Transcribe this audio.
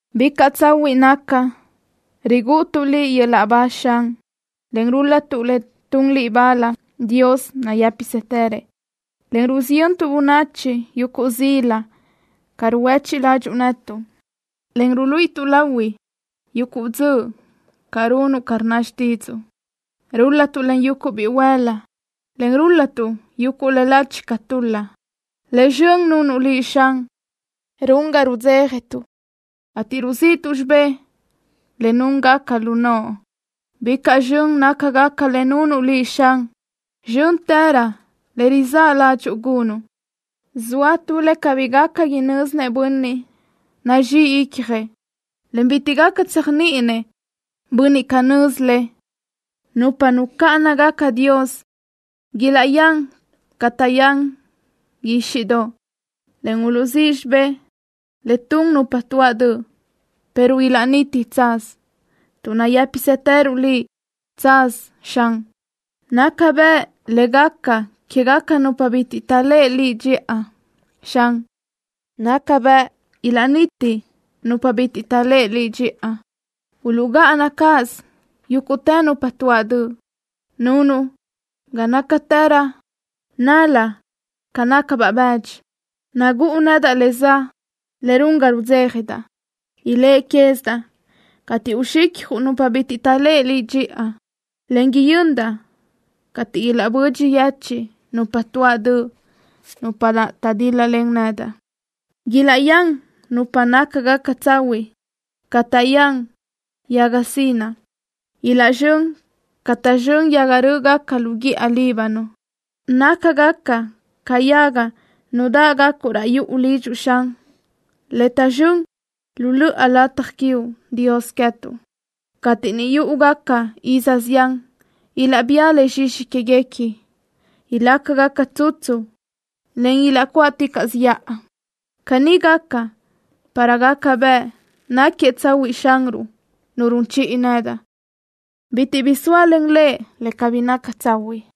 ¡Bicaʼ tsahuiʼ naca rigúʼutuʼ Liʼ yöl-laʼ ba, Xan, en rúl-latuʼ le tun Liʼ bal, Dios nayë́pisëtërëʼ, en rusiyöntuʼ bönachi yuguʼ zila ca ruhuéchiʼ ládxuʼu netuʼ, en ruluíʼituʼ lahui yuguʼ dzöʼ ca runuʼ ca rnna xtídzuʼu! Rúl-latuʼ len yuguʼ bihuël-la, en rúl-latuʼ yuguʼ le lachi ca tul-la. Le zxön nunuʼ Liʼ, Xan, run ga rudzéjatuʼ, ateʼ ruziʼtuʼ xibé le núngaca lu noʼo. Bicaʼ zxön nácagaca le nunuʼ Liʼ, Xan. Zxö́ntërö le rizáʼ ládxuʼu gunuʼ. Zoa tu le cabí gaca inö́zinëʼ bönniʼ nazxí icjëʼ, en bitiʼ gaca tséjniʼinëʼ bönniʼ canö́z le. Nupa nucáʼanagaca Dios ilaʼyán ca taʼyán guíxiʼdoʼ, en uluʼzíʼ xibé le tun nupa tuáʼ döʼ, pero ilaʼniti tsaz, tuʼ nayë́psëtëruʼ Liʼ tsaz, Xan. Naca bëʼ le gaca quégaca nupa bitiʼ taʼléʼe Liʼ dxiʼa, Xan. Naca bëʼ ilaʼniti nupa bitiʼ taʼléʼe Liʼ dxiʼa. Uluʼgáʼana cáʼasö yúguʼtë nupa tuáʼ döʼ. Nunuʼ ga nácatëraʼ nal-la ca nácabaʼ bëdxi. Nagúʼu nedaʼ le za le run ga rudzéjadaʼ. Iléʼe quézidaʼ cateʼ uxicjuʼ nupa bitiʼ taʼléʼe Liʼ dxiʼa, en yöndaʼ cateʼ ilaʼbödxi yechiʼ nupa tuáʼ döʼ, nupa naʼ taʼdíl-lalen nedaʼ. Ilaʼyán nupa nácagaca tsahuiʼ ca taʼyán yaga zinaʼ caʼ. Ilaʼzxö́n ca taʼzxö́n yaga rö́ʼgaca lu guíʼa Líbano. Nácagaca ca yaga nudáʼgacuʼ raʼ yuʼu lidxuʼ, Xan, le taʼzxö́n lu löʼa lataj quiuʼ, Dios queë́tuʼ. Cateʼ niʼ yúʼugaca iz zián ilaʼbía le zxixi quéguequi. Ilácagaca tsutsu, en ilaʼcuáʼticaʼsö yaʼa. Caní gaca para gaca bëʼ náquiëʼ tsahuiʼ Xanruʼ, Nu run chiʼi nedaʼ. Bitiʼ bi zóalen Lëʼ le cabí naca tsahuiʼ.